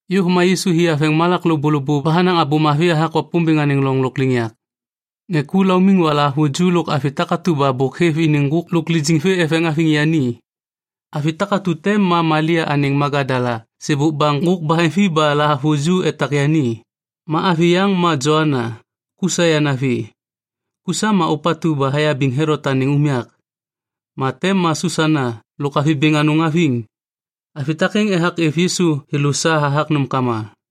Yôv ma Yisu hi haveŋ malak lôbôlôbô ba hanaŋ Abô Mavi hathak Wapômbêŋ anêŋ loŋ lôkliŋyak. Ŋê ku laumiŋ ba lahavuju lôk avi takatu ba bôk hêv iniŋ ŋgôk lôk lijiŋ vê eveŋ haviŋ yani. Avi takatu te ma Malia anêŋ Magadala sêbôk ba ŋgôk baheŋvi ba lahavuju etak yani. Ma avi yaŋ ma Joana, Kusa yanavi. Kusa ma ôpatu ba hayabiŋ Helot anêŋ unyak. Ma te ma Susana lôk avi bêŋ anôŋ haviŋ. Avi takêŋ ethak êv Yisu thêlô sa hathak nômkama.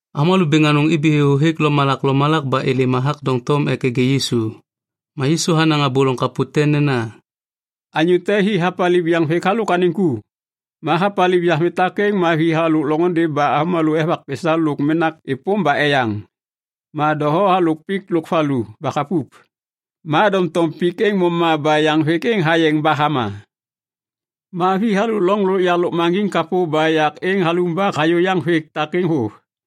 Avômalô bêŋ anôŋ ibi thêthô hêk lomalak lomalak ba êlêm ethak doŋtom ek nêgê Yisu. Ma Yisu hanaŋ abô loŋ kapô te nena, “Anyô te hi hapaliv yaŋvêk halôk anêŋ ku. Ma hapaliv yaŋvêk takêŋ ma vi halôk loŋôndê ba avômalô evak pesa lôk menak êpôm ba eyaŋ. Ma doho halôk pik lôk valu ba hapup. Ma doŋtom pik êŋ moma ba yaŋvêk êŋ hayeŋ ba hama. Ma vi halôk loŋ yak lôkmaŋgiŋ kapô ba yak êŋ halumbak hayô yaŋvêk takêŋ vôv.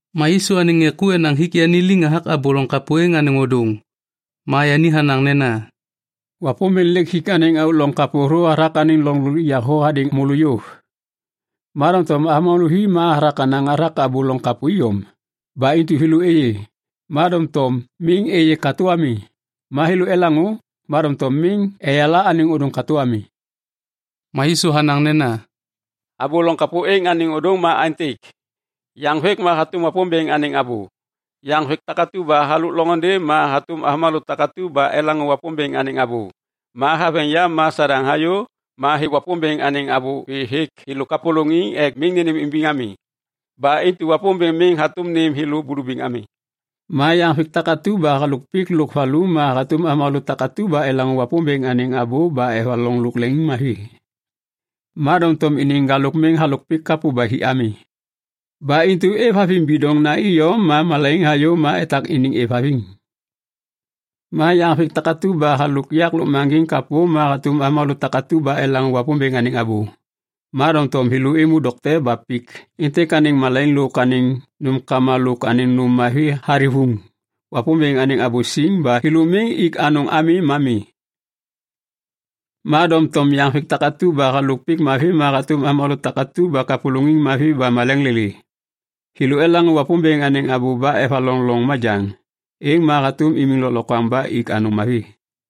Ma Yisu anêŋ ŋê ku enaŋ hik yani liŋ hathak abô loŋ kapô êŋ anêŋ ôdôŋ. Ma yani hanaŋ nena, “Wapômbêŋ lêk hik anêŋ auk loŋ kapô hathak anêŋ loŋ lôkliŋyak thô hadêŋ môlô yôv. Ma doŋtom avômalô vi ma yahathak yahanaŋ hathak abô loŋ kapô iyom. Ba intu “‘thêlô êyê, ma doŋtom miŋ êyê katô ami. Ma thêlô elaŋô, ma doŋtom miŋ eyala anêŋ ôdôŋ katô ami.’” Ma Yisu hanaŋ nena, “Abô loŋ kapô êŋ anêŋ ôdôŋ ma aêntêk. Yaŋvêk ma hatôm Wapômbêŋ anêŋ abô. Yaŋvêk takatu ba halôk loŋôndê ma hatôm avômalô takatu ba elaŋô Wapômbêŋ anêŋ abô, ma haveŋ yam ma Sadaŋ hayô ma hêv Wapômbêŋ anêŋ abô vê hêk thêlô kapôlôŋiŋ ek miŋ nênêmimbiŋ ami. Ba intu Wapômbêŋ miŋ hatôm nêm thêlô bulubiŋ ami. Ma yaŋvêk takatu ba halôk pik lôk valu ma hatôm avômalô takatu ba elaŋô Wapômbêŋ anêŋ abô ba evaloŋ lôk leŋiŋmavi. Ma doŋtom iniŋ ŋgalôk miŋ halôk pik kapô ba hi ami. Ba intu êvhaviŋ bidoŋna iyom ma malaiŋ hayô ma etak iniŋ êvhaviŋ. Ma yaŋvêk takatu ba halôk yak lôkmaŋgiŋ kapô ma hatôm avômalô takatu ba elaŋô Wapômbêŋ anêŋ abô, ma doŋtom thêlô êmô dokte ba pik êntêk anêŋ malaiŋ lôk anêŋ nômkama lôk anêŋ nôm mavi hathivuŋ Wapômbêŋ anêŋ abô siŋ ba thêlô miŋ ik anôŋ ami ma mi. Ma doŋtom yaŋvêk takatu ba halôk pik mavi ma hatôm avômalô takatu ba kapôlôŋiŋ mavi ba maleŋ lêlê. Thêlô elaŋô Wapômbêŋ anêŋ abô ba evaloŋ loŋ majaŋ. Êŋ ma hatôm imiŋ lôklokwaŋ ba ik anôŋ mavi.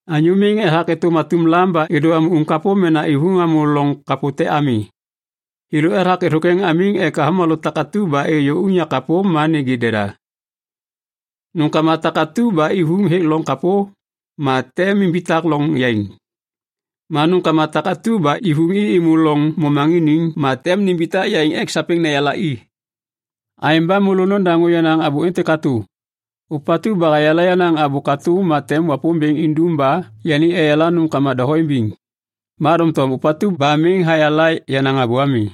“Anyô miŋ ethak êtôm atum lam ba êdô hamô uŋ kapô mena ivuŋ hamô loŋ kapô te ami. Thêlô ethak êthôkwêŋ hamiŋ ek avômalô takatu ba êyô unyak kapô ma nêgê deda. Nômkama takatu ba ivuŋ hêk loŋ kapô ma tem nimbitak loŋ yaiŋ. Ma nômkama takatu ba ivuŋ i êmô loŋ momaŋiniŋ ma tem nimbitak yaiŋ ek sapêŋ neyala i. Aêŋ ba môlô nodaŋô yenaŋ abô êntêk katô. Ôpatu ba hayala yenaŋ abô katô ma tem Wapômbêŋ indum ba yani eyala nômkama doho imbiŋ. Ma doŋtom ôpatu ba miŋ hayala yenaŋ abô ami,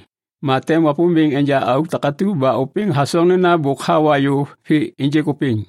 ma tem Wapômbêŋ enja auk takatu ba ôpêŋ hasoŋ nena bôk hawa yôv vê ênjêk ôpêŋ.”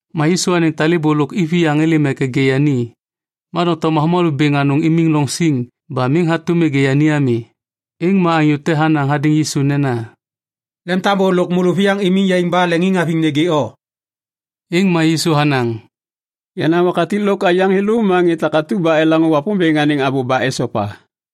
Ma Yisu anêŋ talêbô lôk iviyaŋ êlêm ek nêgê yani, ma doŋtom avômalô bêŋ anôŋ imiŋ loŋ siŋ ba miŋ hatôm nêgê yani ami. Êŋ ma anyô te hanaŋ hadêŋ Yisu nena, “Lemtambô lôk môlôviyaŋ imiŋ yaiŋ ba leŋiŋhaviŋ nêgê o.” Êŋ ma Yisu hanaŋ, “Yenaŋ wakatik lôk aiyaŋ thêlô ma ŋê takatu ba elaŋô Wapômbêŋ anêŋ abô ba esopa.”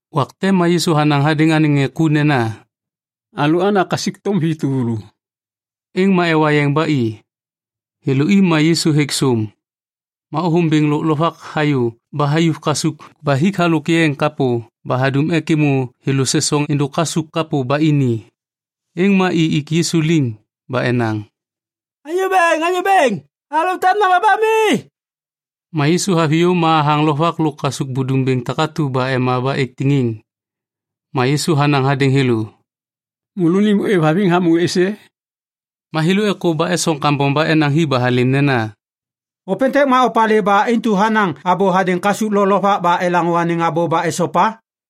Wak te ma Yisu hanaŋ hadêŋ anêŋ ŋê ku nena, “Alôana kasukthôm vi tuvulu.” Êŋ ma ewa yeŋ ba i. Thêlô i ma Yisu hêk sôm. Ma ôthôm bêŋ lôk lovak hayô ba hayuv kasuk ba hik halôk yeŋ kapô ba hadum ek êmô thêlô sesoŋ êndôk kasuk kapô ba ini. Êŋ ma i ik Yisu liŋ ba enaŋ, “Anyô bêŋ, anyô bêŋ, alalô tem nama ba mi!” Ma Yisu haviyô ma hathaŋ lovak lôk kasuk budum bêŋ takatu ba ema ba êk tiŋiŋ. Ma Yisu hanaŋ hadêŋ thêlô, “Môlônim ôêvhaviŋ hamô êsê?” Ma thêlô êkô ba esoŋ kambom ba enaŋ hi ba halêm nena, “Ôpêntêk ma opalê ba intu hanaŋ abô hadêŋ kasuk lo lovak ba elaŋô anêŋ abô ba esopa?”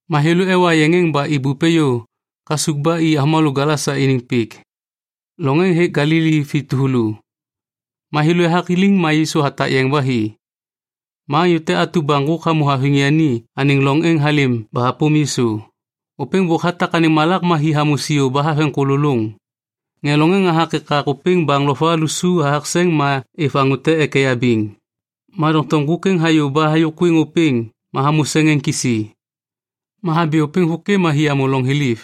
Ma thêlô ewa yeŋ êŋ ba ibup êyô kasuk ba i avômalô Gelasa iniŋ pik. Loŋ êŋ hêk Galili vi tuvulu. Ma thêlô ethak liŋ ma Yisu hatak yeŋ ba hi, ma anyô te atu ba ŋgôk hamô haviŋ yani anêŋ loŋ êŋ halêm ba hapôm Yisu. Ôpêŋ bôk hatak anêŋ malak ma hi hamô siô ba haveŋ kôlôlôŋ. Ŋê loŋ êŋ ethak ekak ôpêŋ baŋ lo va lusu hathak seŋ ma êv anyô te ek eyabiŋ, ma doŋtom ŋgôk êŋ hayô ba hayôkwiŋ ôpêŋ ma hamô seŋ êŋ kisi. Ma habi ôpêŋ vôkê ma hi hamô loŋ thiliv.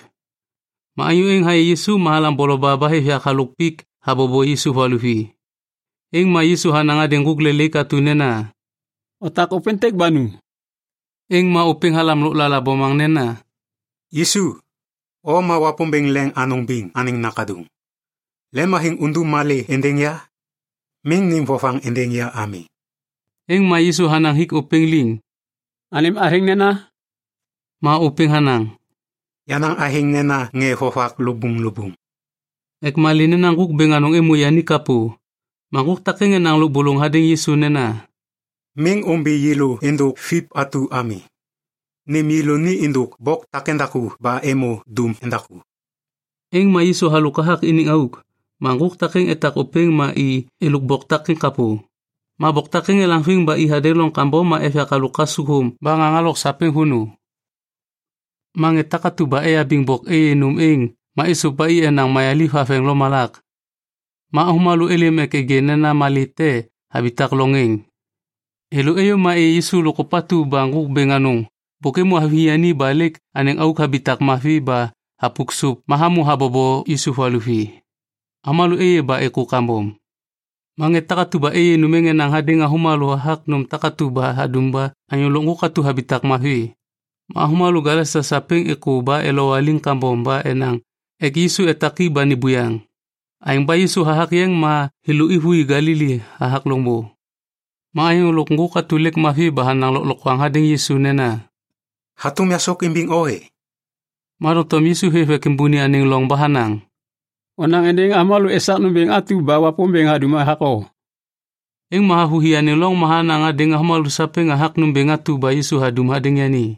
Ma anyô êŋ hayê Yisu ma halaŋ boloba ba hêv yak halôk pik habobo Yisu valuvi. Êŋ ma Yisu hanaŋ hadêŋ ŋgôk lelaik atu nena, “Otak ôpêntêk ba nu.” Êŋ ma ôpêŋ halam lôklala bomaŋ nena, “Yisu, o ma Wapômbêŋ Leŋ Anôŋ Biŋ anêŋ Nakaduŋ, lemhaviŋ undum malê êndêŋ ya? Miŋ nêm vovaŋ êndêŋ ya ami!” Êŋ ma Yisu hanaŋ hik ôpêŋ liŋ, “Anêm athêŋ nena?” Ma ôpêŋ hanaŋ, “Yenaŋ athêŋ nena Ŋê Vovak Lubuŋlubuŋ” ek malê nena ŋgôk bêŋ anôŋ êmô yani kapô. Ma ŋgôk takêŋ enaŋ lôbôlôŋ hadêŋ Yisu nena, “Miŋ ômbi yêlô êndôk Viv atu ami. Nêm yêlô ni êndôk bok takêŋdaku ba êmô dum endaku.” Êŋ ma Yisu halôk hathak iniŋ auk. Ma ŋgôk takêŋ etak ôpêŋ ma i êlôk bok takêŋ kapô. Ma bok takêŋ elaŋviŋ ketheŋ ba i hadêŋ loŋ kambom ma êv yak halôk kasukthôm ba ŋaŋ halok sapêŋ vônô. Ma ŋê takatu ba eyabiŋ bok êyê nôm êŋ ma êsôv ba i enaŋ mayaliv haveŋ lomalak. Ma avômalô êlêm ek nêgê nena malê te habitak loŋ êŋ. Thêlô êyô ma êyê Yisu lôk ôpatu ba ŋgôk bêŋ anôŋ bôk êmô haviŋ yani ba lêk anêŋ auk habitak mavi ba hapuk sôp ma hamô habobo Yisu valuvi. Avômalô êyê ba êkô kambom. Ma ŋê takatu ba êyê nôm êŋ enaŋ hadêŋ avômalô hathak nôm takatu ba hadum ba anyô lôk ŋgôk atu habitak mavi. Ma avômalô Gelasa sapêŋ êkô ba elowaliŋ kambom ba enaŋ ek Yisu etak i ba ni buyaŋ. Aêŋ ba Yisu hathak yeŋ ma thêlô êvôi Galili hathak loŋbô. Ma anyô lôk ŋgôk atu lêk mavi ba hanaŋ lôklokwaŋ hadêŋ Yisu nena, “Hatôm yasôk imbiŋ o e?” Ma doŋtom Yisu hêv ek êmbôni anêŋ loŋ ba hanaŋ, “Onaŋ êndêŋ avômalô esak nômbêŋ atu ba Wapômbêŋ hadum hathak o.” Êŋ ma havôhi anêŋ loŋ ma hanaŋ hadêŋ avômalô sapêŋ hathak nômbêŋ atu ba Yisu hadum hadêŋ yani.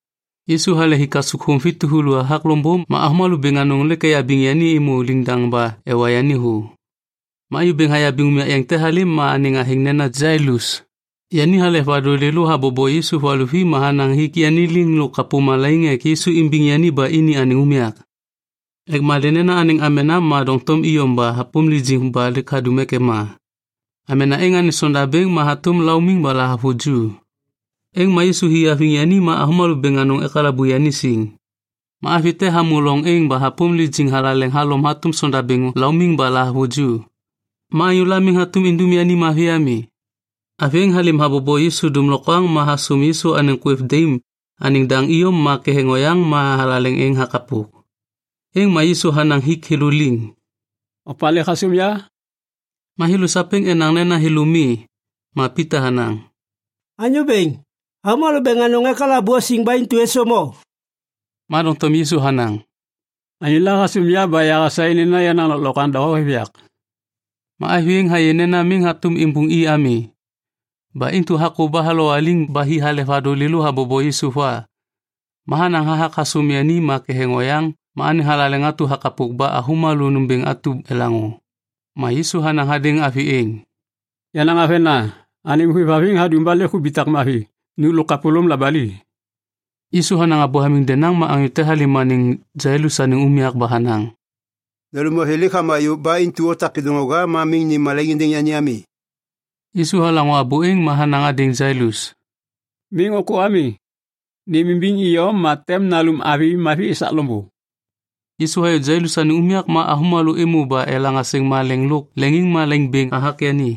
Yisu hale hi kasukthôm vi tuvulu hathak loŋbô ma avômalô bêŋ anôŋ lêk eyabiŋ yani êmô liŋdaŋ ba ewa yani thô. Ma anyô bêŋ hayabiŋ unyak yeŋ te halêm ma anêŋ athêŋ nena Jailus. Yani halek vadôŋ lêlô habobo Yisu valuvi ma hanaŋ hik yani liŋ lôk kapô malaiŋ ek Yisu imbiŋ yani ba ini anêŋ unyak. Ek malê nena anêŋ amena ma doŋtom iyom ba hapôm lijiŋ ba hadum ek ema. Amena êŋ anêŋ sondabêŋ ma hatôm laumiŋ ba lahavuju. Êŋ ma Yisu hi haviŋ yani ma avômalô bêŋ anôŋ ekalabu yani siŋ. Ma avi te hamô loŋ êŋ ba hapôm lijiŋ thalaleŋ halom hatôm sondabêŋ laumiŋ ba lahavuju. Ma anyôla miŋ hatôm idum yani mavi ami. Avi êŋ halêm habobo Yisu dômlokwaŋ ma hasôm Yisu anêŋ kwêv daim anêŋ daŋ iyom ma ketheŋ oyaŋ ma thalaleŋ êŋ hakapok. Êŋ ma Yisu hanaŋ hik thêlô liŋ, “Opalê hasôm ya?” Ma thêlô sapêŋ enaŋ nena thêlô mi. Ma Pita hanaŋ, “Anyô Bêŋ, avômalô bêŋ anôŋ ekalabu o siŋ ba intu êsôm o.” Ma doŋtom Yisu hanaŋ, “Anyôla hasôm ya ba yahasaê nena yenaŋ lôklokwaŋ doho hêv yak.” Ma avi êŋ hayê nena miŋ hatôm imbuŋ i ami. Ba intu hakô ba halowaliŋ ba hi halek vadôŋ lêlô habobo Yisu va. Ma hanaŋ hathak hasôm yani ma ketheŋ oyaŋ ma anêŋ thalaleŋ atu hakapok ba avômalô nômbêŋ atu elaŋô. Ma Yisu hanaŋ hadêŋ avi êŋ, “Yenaŋ avena, anêm hôêvhaviŋ hadum ba lêk hubitak mavi. Nu lôk kapôlôm labali.” Yisu hanaŋ abô hamiŋ denaŋ ma anyô te halêm anêŋ Jailus anêŋ unyak ba hanaŋ, “Nalum avi lêk hama yôv ba intu otak kêdôŋwaga ma miŋ nêm malaiŋ êndêŋ yani ami.” Yisu halaŋô abô êŋ ma hanaŋ hadêŋ Jailus, “Miŋ ôkô ami. Nêmimbiŋ iyom ma tem nalum avi mavi esak loŋbô.” Yisu hayô Jailus anêŋ unyak ma avômalô êmô ba elaŋ asêŋ malêŋ lôk leŋiŋmalaiŋ bêŋ hathak yani.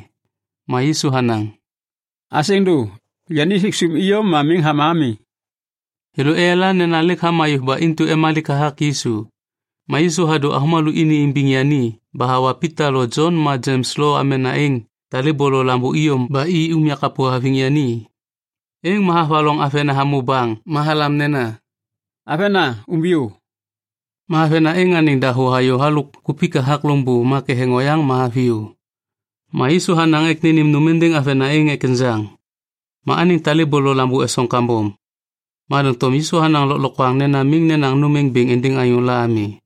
Ma Yisu hanaŋ, “Asêŋ dô. Yani hêk sôm iyom ma miŋ hama ami.” Thêlô eyala nena lêk hama yôv ba intu emalik hathak Yisu. Ma Yisu hadô avômalô ini imbiŋ yani ba hawa Pita lo Jon ma Jems lôk amena êŋ talêbô lo lambô iyom ba i unyak kapô haviŋ yani. Êŋ ma havaloŋ avena hamô baŋ ma halam nena, “Avena, umbiyô!” Ma avena êŋ anêŋ dahô hayô halôk kupik hathak loŋbô ma ketheŋ oyaŋ ma haviyô. Ma Yisu hanaŋ ek nênêm nôm êndêŋ avena êŋ ek enjaŋ. Ma anêŋ talêbô lo lambô esoŋ kambom. Ma doŋtom Yisu hanaŋ lôklokwaŋ nena miŋ nenaŋ nôm êŋ bêŋ êndêŋ anyôla ami.